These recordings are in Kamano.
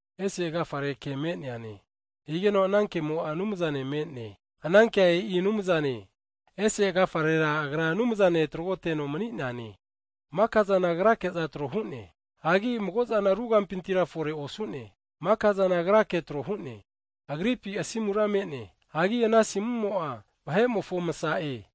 Ese agafare Ke me'neane, higeno ana Kemo'a Anumzane me'ne, ana Kea e'i Anumzane. Ese agafarera Agra Anumzane tragoteno mani'neane. Maka'zana Agrake'za tro hu'ne, hagi mago'zana ru kampintira fore osu'ne, makazana Agrake tro hu'ne. Agripi asimura me'ne, hagi ana asimumo'a vahe'mofo Masa'e.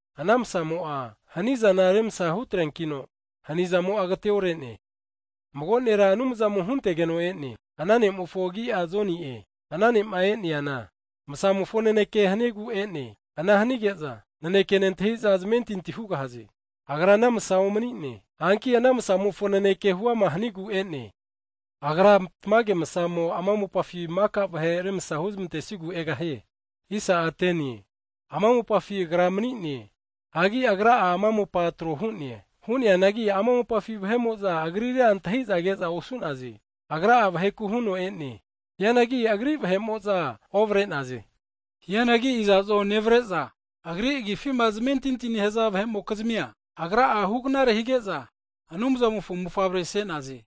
Ana masamo'a hanizana remsa hunetreankino hanizamo'a agateore'ne. Hagi mago nera Anumzamo huntegeno e'ne, Ana ne'mofo agi'a Joni'e. Ana ne'ma e'neana, Masamofo naneke hanigu e'ne. Ana hanige'za naneke'a nentahiza zamentinti hugahaze. Agra ana masa omani'ne, hanki ana masamofo naneke hu'ama hanigu e'ne. Agra tamage masamo ama mopafi maka vahe remsa huzmentesigu ne-e. Ama mopafi Agra mani'ne, hagi Agra'a ama mopa tro hu'ne, hu'neanagi ama mopafi vahe'mo'za Agrira antahi'za ke'za osu'naze. Agra'a vaheku huno e'ne, hianagi Agri vahe'mo'za ovare'naze. Hianagi iza'zo nevare'za Agri agifima zamentintima nehaza vahe'mokizmia, Agra'a hugnare hige'za Anumzamofo mofavre se'naze.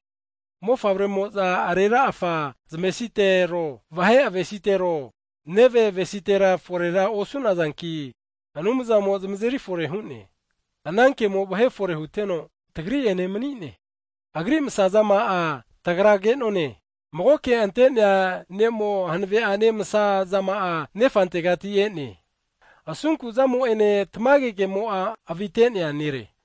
Hagi Anumzamofo mofavrema senazana arera afa zamesitero, vahe avesitero, neve avesitera forera osunazanki, Anumzamo zamazeri fore hu'ne. Ana Kemo vahe fore huteno, tagri'ene mani'ne. Agri masazama'a tagra ke'none, magoke ante'nea Ne'mo hanave'ane masa zama'ane Nefantegati e'ne. Asunku zamo'ene tamage kemo'a avite'nea Nere.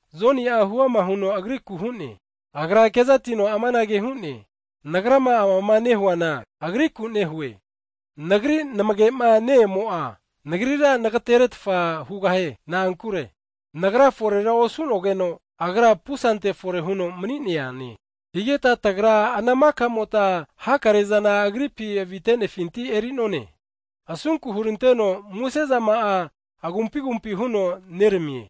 Joni'a huama huno Agriku hu'ne. Agra kezatino amanage hu'ne, nagrama amama nehuana Agriku nehue, nagri namage'ma ne-emo'a, nagrira nagateretfa hu'ne. Na'ankure nagra fore osu'nogeno Agra pusante fore huno mani'neane. Higeta tagra ana maka'mota hakare zana Agripi avitenefinti e'nerunkeno, asunku huranteno muse zama'a agumpi agumpi huno neramie.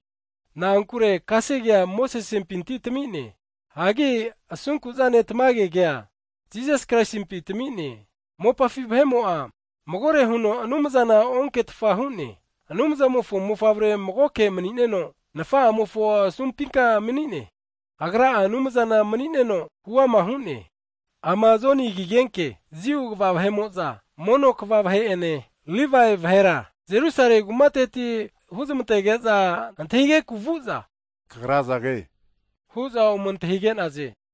Na'ankure kasegea Mosesempi tami'ne. Hagi asunku'zane tamage kea, Jisas Kraisimpi tami'ne. Mopafi vahe'mo'a magore huno Anumzana onketfa hu'ne. Anumzamofo mofavrea magoke mani'neno, Nafa'amofo asumpinka mani'ne, Agra'a Anumzana mani'neno huama hu'ne. Hagi Jiu kva vahe'mo'za, mono kva pristi vahe'ene Livae vahera Jerusalemi kumateti huma zamantage'za Jonina antahigeku vu'za, Kagra azage? hu'za ome antahige'naze.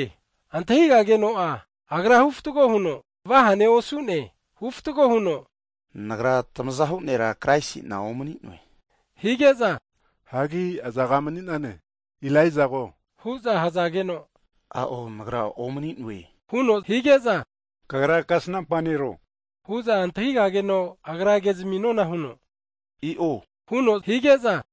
Antahigageno'a agra huama nehuno vahane osuno, huama huno, Nagra tamazahu nera Kraisi'na omani'noe. Hige'za, hagi azaga mani'nane? Elaijago? hu'za hazageno, a'o, nagra Elaijana omani'noe huno hige'za, kagra kasnampa nero? hu'za antahigageno, agra kezmi nona huno, i'o huno hu'ne.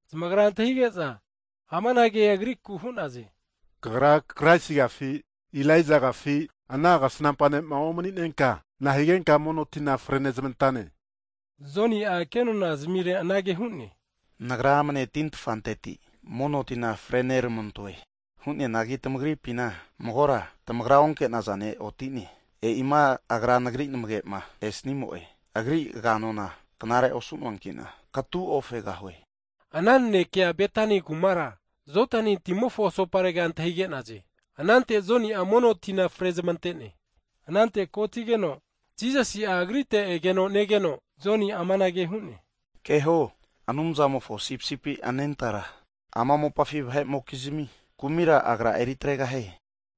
zamagra antahige'za, amanage agriku hu'naze, kagra Kraisigafi, Elaijagafi, mago Kasnampa ne'ma omaninenka, nahigenka mono tina fre nezmantane? Joni'a kenona zamirera anage hu'ne, nagra amne tintfanteti mono tina frenermantoe. Hu'neanagi tamagri amunompina magora tamagra keta antahita osu'naza ne' oti'ne. E'ima Agra nagri nmage'ma esanimofona Agri aga'nona knare osu'noankina katu ofegahue. Ana nanekea Betani kumara Jodani timofo asoparega Joni'ma mono tima frenezmanterega antahigazageno zmasami'ne. Anante kotigeno Jisasi'a agrite egeno negeno, Joni'a amanage hu'ne, keho, Anumzamofo Sipisipi anentara, ama mopafi vahe'mokizmi kumira, Agra eri atregahie!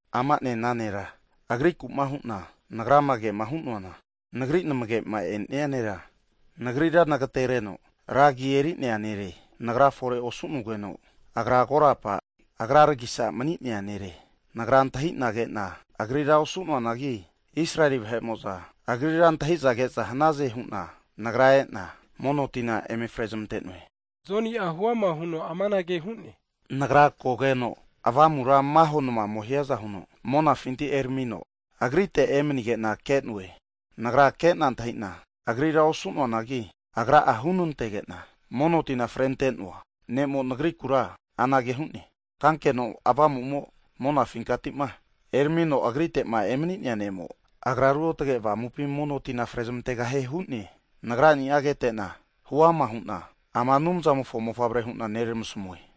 Ama'ne ana nera, Agriku'ma hu'na nagrama kema hu'noana, nagri namge'ma esnia nera, nagrira nagatereno ra agi eri'nea nere, nagra fore osu'nogeno, Agra korapa Agraragisa mani'nea nere. Nagra antahi'na ke'na Agrira osu'noanagi, Israeli vahe'mo'za Agrira antahiza keza hanaze hu'na, nagra ena mono tina eme frezmante'noe. Joni'a huama huno amanage hu'ne, Nagra kogeno Avamura maho namamo hiaza huno monafinti eramino Agrite emanige'na ke'noe. Nagra ke'na antahi'na Agrira osu'noanagi, mono tima frezmanto huno'ma hunante'nea ne'mo'a anage huno nasmi'ne, kesnankenoma Avamumo'ma monafinkati'ma eramino Agrite'ma emani'nea ne'mo, Agra Ruotge Avamupina mono tina fre zamantegahie hu'ne. Nagrani'a kete'na, huama hu'na ama Anumzamofo mofavre hu'na neramasmue.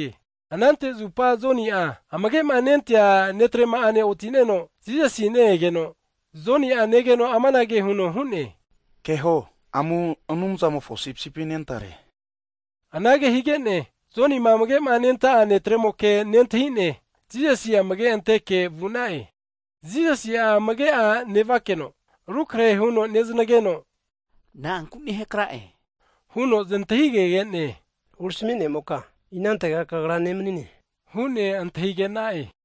Anante zupa Joni'a, amage'ma nenta'a disaipoli netrema'ane oti'neno, Jisasi'a ne-egeno Joni'a negeno amanage huno hu'ne, Keho, amu Anumzamofo Sipisipi anentare, anage hige'ne, Joni amagema nenta'a disaipol netremoke nentahi'ne, Jisasi amage'anteke vu'na'e. Jisasi'a amage'a nevakeno rukrahe huno neznageno, Na'anku nehakra'e? huno znantahigege'ne, Rempi hurami ne'moka inante Kagra nemanine? hu'ne antahigena'e.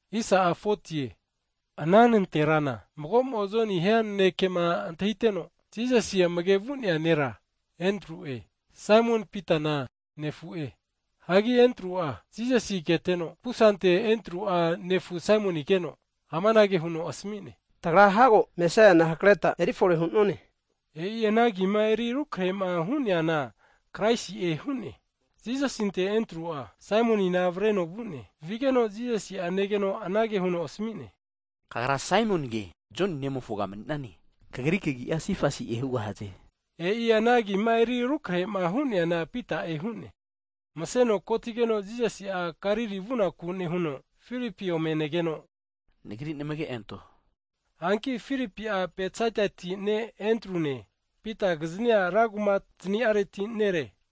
Hagi nanterana mago'mo Joni hiankema antahiteno Jisasi amage'ma vu'nea nera Endru'e, Saimon Pitana nefu'e. Hagi Endru'a, Jisasima keteno pusante Endru'a nefu Saimoni keno, amanage huno asami'ne. Tagra hago Mesaiana hakreta erifore hu'none. (E'i ana agima eri rukrehe'ma hu'neana Kraisi'e hu'ne.) Jisasinte Endru'a, Saimonina avreno vu'ne. Vigeno Jisasi'a negeno anage huno asmi'ne, Kagra Saimonige Joni nemofoga mani'nane, kagri kagi'a Sifasi'e hugahaze. (E'i ana agima eri rukrehe'ma hu'neana Pita'e hu'ne.) Mseno kotigeno Jisasi'a Galili vunaku nehuno Filipi ome negeno, Nagri namage anto hu'ne. Hanki Filipi'a Betsaidati ne' Andrune, Pitakiznia rankuma zani'areti nere.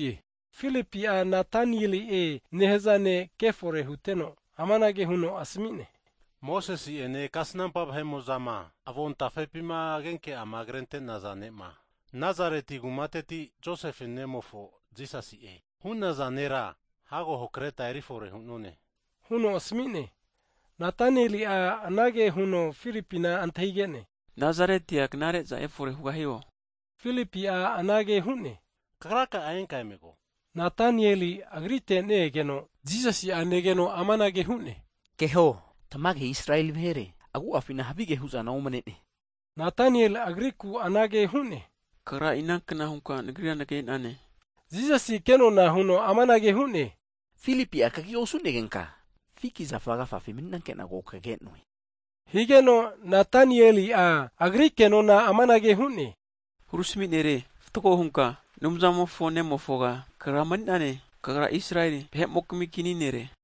Filipi'a, Natanieli'e nehaza ne' kefore huteno amanage huno asmi'ne, Mosesi'ene kasnampa vahe'mo'zama avontafepima agenke'ama krente'naza Ne'ma, Nazareti kumateti Josefe nemofo Jisasi'e hu'naza nera hago hakreta erifore hu'none, huno asmi'ne. Natanieli'a anage huno Filipina antahige'ne, Nazaretia knare'zana efore hugahio? Filipi'a anage hu'ne, kagraka'a enka emego. Natanieli'a Agritega ne-egeno Jisasi'a negeno amanage hu'ne, Keho, tamage Israeli vahere agu'afina havige hu'zana omne'ne! Natanieli'a Agriku anage hu'ne. Kagra inankna hunka nagrira nage'nane? Jisasi'a ke'nona huno amanage hu'ne, Filipi'a kagi osu'negenka fiki zafa agafafi mani'nanke'na ko kage'noe. Higeno Natanieli'a Agri ke'nona amanage hu'ne, Hurami nere, Kagra fatgo hunka Anumzamofo nemofoga mani'nane. Kagra Israeli vahe'mokizmi Kini nere.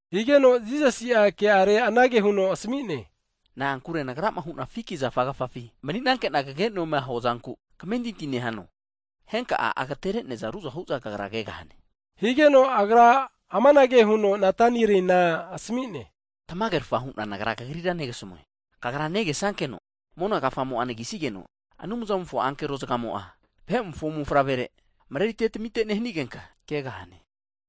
Higeno, Jisasi'a ke'are anage huno asmi'ne, Na'ankure Nagrama hu'na fiki zafa agafafi mani'nanke'na kage'noema huazanku kamentinti nehano? Henka'a agatere'neaza ruzahu'za kagra kegahane. Higeno Jisasi'a mago'ane amanage huno Natanielina asami'ne, Tamagerafa hu'na Nagra kagrira negasamue, kagra negesankeno mona kafamo'a anagisigeno, Anumzamofo ankero zagamo'za, Vahe'mofo Mofavrere mareriza tamiza nehanigenka kegahane.